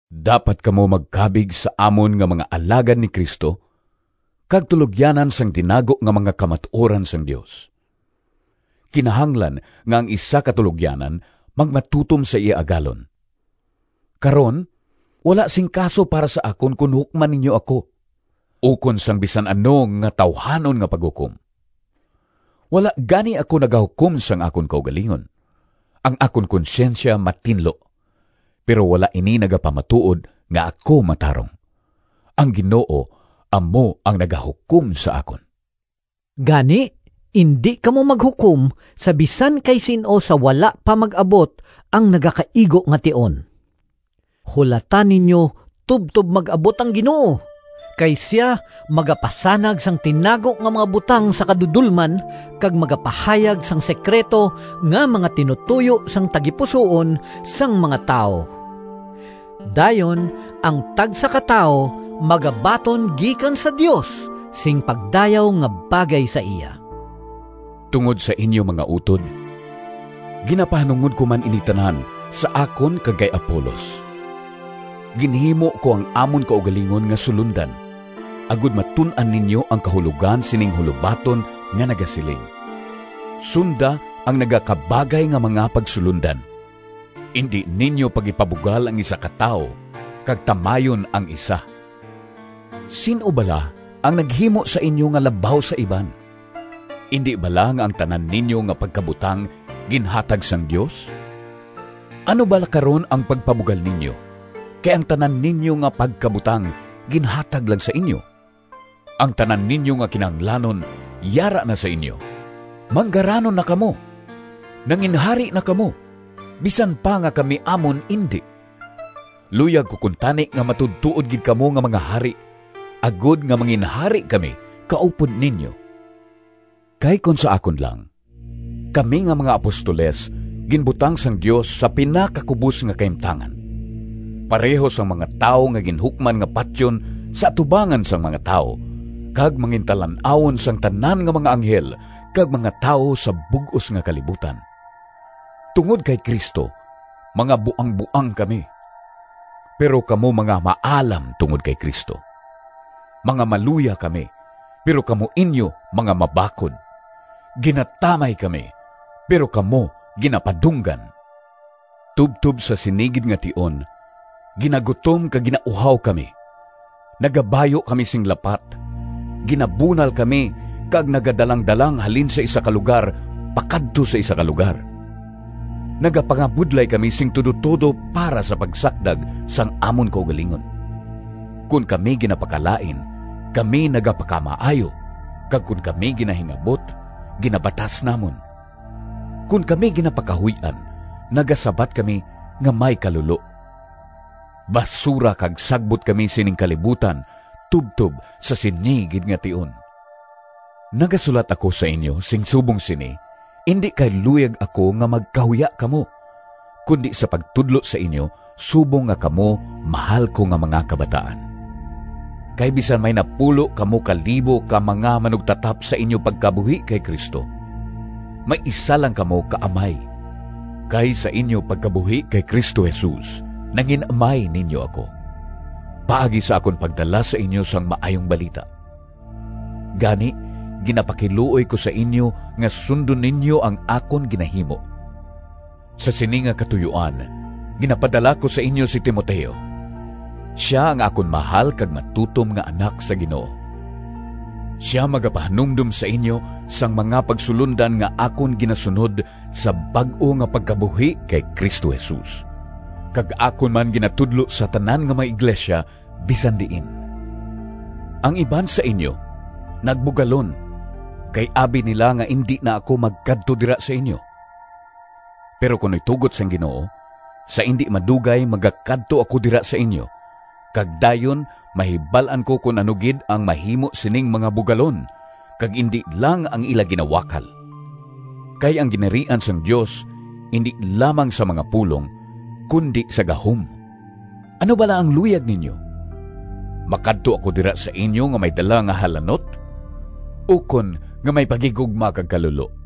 Dapat kamo magkabig sa amon nga mga alagad ni Cristo kag tulogyanan sang tinago nga mga kamatuoran sang Dios. Kinahanglan nga ang isa ka tulogyanan magmatutom sa iya agalon. Karon, wala sing kaso para sa akon kon hukman ninyo ako, ukon sang bisan ano nga tawuhanon nga paghukom. Wala gani ako nagahukom sang akon kaugalingon. Ang akon konsyensya matinlo, pero wala ini nagapamatuod nga ako matarong. Ang Ginoo amo ang nagahukom sa akon. Gani indi kamo maghukom sa bisan kay sin-o sa wala pa mag-abot ang nagakaigo nga tion. Hulata ninyo tubtob mag-abot ang Ginoo, kay sia magapasanag sang tinago nga mga butang sa kadudolman, kag magapahayag sang sekrito nga mga tinutoyo sang tagipusoon sang mga tawo. Dayon ang tagsa ka tawo magabaton gikan sa Dios sing pagdayaw nga bagay sa iya. Tungod sa inyo, mga utod, ginapahanungod ko man ini tanan sa akon kag kay Apolos. Ginhimo ko ang amon kaugalingon nga sulondan, agod matun-an ninyo ang kahulogan sining hulobaton nga nagasiling, “Sunda ang nagakabagay nga mga pagsulondan.” Indi ninyo pag-ipabugal ang isa ka tawo kag tamayon ang isa. Sin-o bala ang naghimo sa inyo nga labaw sa iban? Indi bala nga ang tanan ninyo nga pagkabutang ginhatag sang Dios? Ano bala karon ang pagpabugal ninyo, kay ang tanan ninyo nga pagkabutang ginhatag lang sa inyo? Ang tanan ninyo nga kinahanglanon yara na sa inyo! Manggaranon na kamo! Nanginhari na kamo, bisan pa nga kami amon indi! Luyag ko kuntani nga matuodtuod gid kamo nga mga hari, agod nga manginhari kami kaupod ninyo. Kay kon sa akon lang kami nga mga apostoles ginbutang sang Dios sa pinakakubos nga kahimtangan, pareho sang mga tawo nga ginhukman nga patyon sa atubangan sang mga tawo kag mangintalan-awon sang tanan nga mga anghel kag mga tawo sa bug-os nga kalibutan. Tungod kay Cristo mga buangboang kami, pero kamo mga maalam tungod kay Cristo. Mga maluya kami, pero kamo inyo mga mabakod! Ginatamay kami, pero kamo ginapadunggan! Tubtob sa sini gid nga tion ginagutom kag ginauhaw kami, nagabayu kami sing lapat, ginabunal kami kag nagadalang-dalang halin sa isa ka lugar pakadto sa isa ka lugar. Nagapangabudlay kami sing tudotudo para sa pagsakdag sang amon kaugalingon. Kon kami ginapakalain, kami nagapakamaayo kag kon kami ginahingabot, ginabatas namon. Kon kami ginapakahuy-an, nagasabat kami nga may kalulo. Basura kag sagbot kami sining kalibutan tubtob sa sini gid nga tion! Nagasulat ako sa inyo sing subong sini, indi kay luyag ako nga magkahuya kamo, kundi sa pagtudlo sa inyo subong nga kamo mahal ko nga mga kabataan. Kay bisan may napulo kamo ka libo ka mga manugtatap sa inyo pagkabuhi kay Cristo, may isa lang kamo ka amay. Kay sa inyo pagkabuhi kay Cristo Jesus nangin-amay ninyo ako, paagi sa akon pagdala sa inyo sang Maayong Balita. Gani, ginapakiluoy ko sa inyo nga sundon ninyo ang akon ginahimo. Sa sini nga katuyoan, ginapadala ko sa inyo si Timoteo. Sia ang akon mahal kag matutom nga anak sa Ginoo. Sia magapahanumdom sa inyo sang mga pagsulondan nga akon ginasunod sa bag-o nga pagkabuhi kay Cristo Jesus, kag akon man ginatudlo sa tanan nga mga iglesia bisan diin. Ang iban sa inyo nagbugalon kay abi nila nga indi na ako magkadto dira sa inyo. Pero kon itugot sang Ginoo, sa indi madugay magakadto ako dira sa inyo, kag dayon mahibal-an ko kon ano gid ang mahimo sining mga bugalon, kag indi lang ang ila ginawakal! Kay ang Ginharian sang Dios indi lamang sa mga pulong, kundi sa gahom. Ano bala ang luyag ninyo? Makadto ako dira sa inyo nga may dala nga halanot, ukon nga may paghigugma kag kalulo?